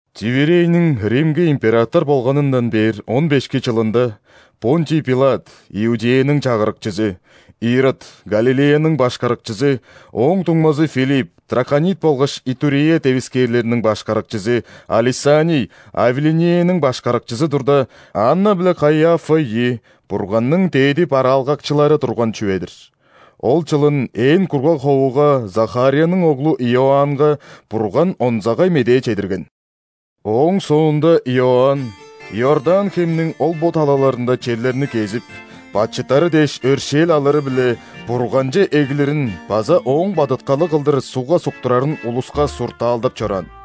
Тиверийниң Римге император болганындан бээр он бешки чылында, ·Понтий Пилат – Иудеяның чагырыкчызы, Ирод – Галилеяның башкарыкчызы, ооң дуңмазы Филипп – Траконит болгаш Итурея девискээрлерниң башкарыкчызы, а Лисаний – Авиленеяның башкарыкчызы турда, Анна биле Каиафа ийи Бурганның дээди бараалгакчылары турган чүве-дир. Ол чылын ээн кургаг ховуга Захарияның оглу Иоаннга Бурган онзагай медээ чедирген. Ооң соонда Иоанн Иордан хемниң ол-бо талаларында черлерни кезип, бачыттары дээш өршээл алыры-биле, Бурганче эглирин база ооң бадыткалы кылдыр ·сугга суктурарын улуска суртаалдап чораан.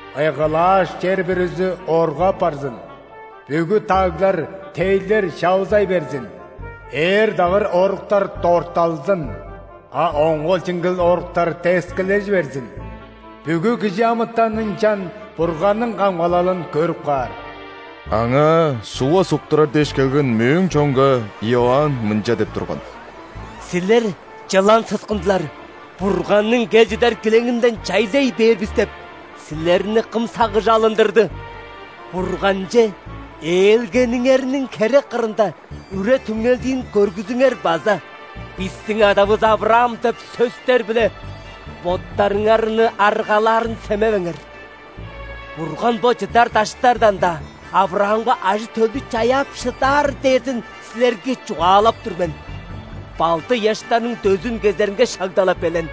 Ыйгылааш чер бүрүзү оргу апарзын,бүгү даглар, тейлер чавызай берзин.Ээр-дагыр оруктар дортталзын,а оңгул-чиңгил оруктар дескилежи берзин. Бүгү кижи амытан ынчан Бурганның камгалалын көрүп каар!“». Аңаа ·сугга суктурар дээш келген мөөң чонга Иоанн мынча деп турган: «Силер, чылан сыскындылары! „Бурганның кел чыдар килеңинден чайлай бээр бис“ – деп, силерни кым сагыш алындырды? Бурганче ээлгениңерниң херек кырында үре-түңнелдиин көргүзүңер база: „Бистиң адавыс ·Авраам“ – деп сөстер-биле боттарыңарны аргалаарын семевеңер! Бурган бо чыдар даштардан-даа Авраамга ажы-төлдү чаяап шыдаар дээрзин силерге чугаалап тур мен. Балды ыяштарның дөзүн кезеринге шагда-ла белен.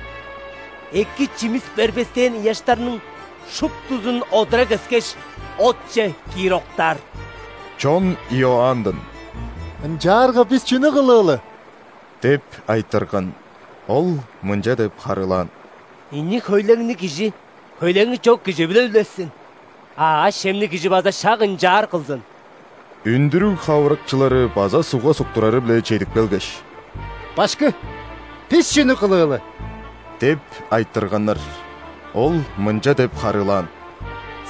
Эки чимис бербестээн ыяштарның шуптузун одура кескеш, отче киир октаар». Чон Иоанндан: «Ынчаарга бис чүнү кылыылы?» – деп айтырган. Ол мынча деп харыылаан: «Ийи хөйлеңниг кижи хөйлеңи чок кижи-биле үлешсин; а аъш-чемниг кижи база шак ынчаар кылзын». Үндүрүг хавырыкчылары база ·сугга суктурары-биле чедип келгеш: «Башкы, бис чүнү кылыылы?» – деп айтырганнар. Ол мынча деп харыылаан: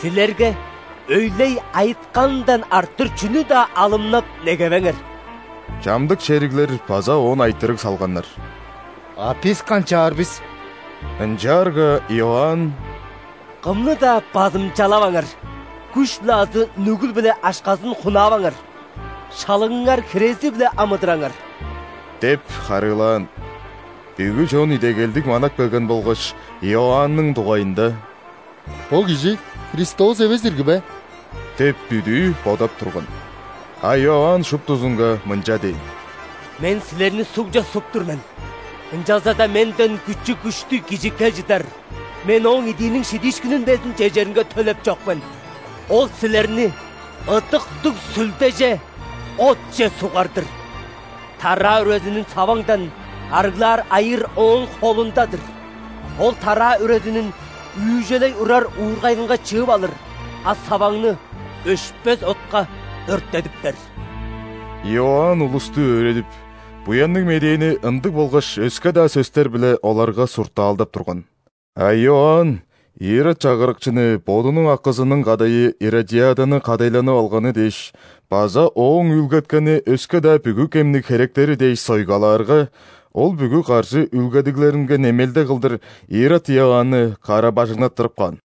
«Силерге өйлей айытканындан арттыр чүнү-даа алымнап негевеңер». Чамдык шериглер база оон айтырыг салганнар: «А бис канчаар бис?» Ынчаарга Иоанн: «Кымны-даа базымчалаваңар, күш-биле азы нүгүл-биле акшазын хунааваңар, шалыңыңар хирези-биле амыдыраңар» – деп харыылаан. Бүгү чон идегелдиг манап келген болгаш, Иоанның дугайында: «Бо кижи Христос эвес ирги бе?» деп бүдүү бодап турган. А Иоанн шуптузунга мынча дээн: «Мен силерни ·сугже суп тур мен, ынчалза-даа менден күчү-күштүг Кижи кел чыдар, мен Ооң идииниң шидиишкинин безин чежеринге төлеп чок мен. Ол силерни Ыдыктыг Сүлдеже, отче сугар-дыр. Тараа үрезинин саваңдан арыглаар айыыр Ооң холунда-дыр, Ол тараа үрезинин үүжелей урар уургайынга чыып алыр, а саваңны өшпес отка өрттедиптер». Иоанн улусту өөредип, Буянныг Медээни ындыг болгаш өске-даа сөстер-биле оларга суртаалдап турган. А Иоанн Ирод чагырыкчыны бодунуң акызының кадайы Иродиаданы кадайланып алганы дээш база ооң үүлгеткени өске-даа бүгү кемниг херектери дээш сойгалаарга, ол бүгү каржы үүлгедиглеринге немелде кылдыр Ирод Иоанны кара-бажыңнаттырып каан.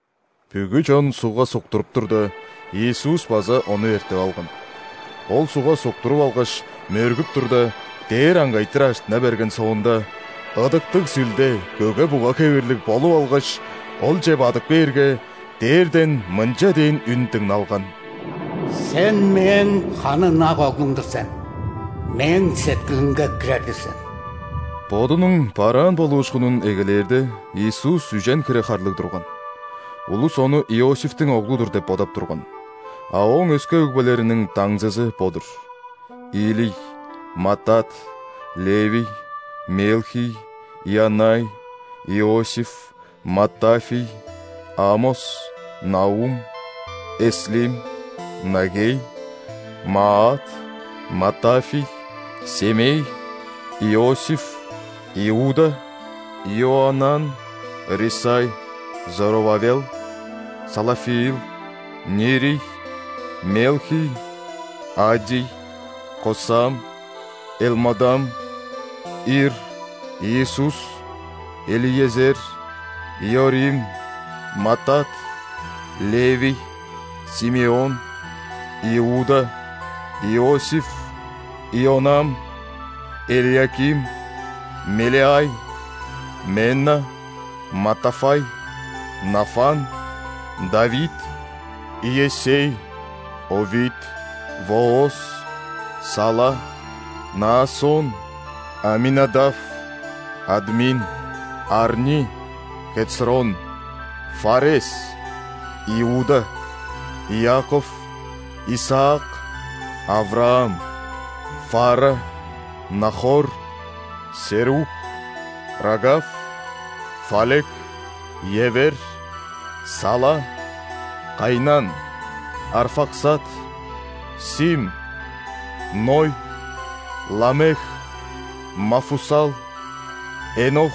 Бүгү чон ·сугга суктуруп турда, Иисус база ону эртип алган. Ол сугга суктуруп алгаш, мөргүп турда, дээр аңгайтыр ажыттына берген соонда, Ыдыктыг Сүлде көге-буга хевирлиг болуп алгаш, Олче бадып кээрге, дээрден мынча дээн үн дыңналган: «Сен Мээң ханы ынак Оглум-дур сен, Мээң сеткилимге кирер-дир сен!» Бодунуң бараан болуушкунун эгелээрде, Иисус үжен хире харлыг турган. Улус Ону Иосифтиң оглу-дур деп бодап турган. А Ооң өске өгбелериниң даңзызы бо-дур: Илий, Маттат, Левий, Мелхий, Ианнай, Иосиф, Маттафий, Амос, Наум, Эслим, Наггей, Маат, Маттафий, Семей, Иосиф, Иуда, Иоаннан, Рисай, Зоровавел, Салафиил, Нирий, Мелхий, Аддий, Косам, Элмодам, Ир, Иисус, Элиезер, Иорим, Маттат, Левий, Симеон, Иуда, Иосиф, Ионам, Элиаким, Мелеай, Менна, Маттафай, Нафан, Давид, Иессей, Овид, Вооз, Сала, Наассон, Аминадав, Админ, Арни, Хецрон, Фарес, Иуда, Иаков, Исаак, Авраам, Фарра, Нахор, Серух, Рагав, Фалек, Евер, Сала, Кайнан, Арфаксад, Сим, Ной, Ламех, Мафусал, Энох,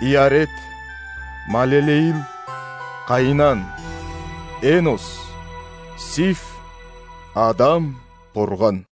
Иаред, Малелеил, Каинан, Энос, Сиф, Адам – Бурган.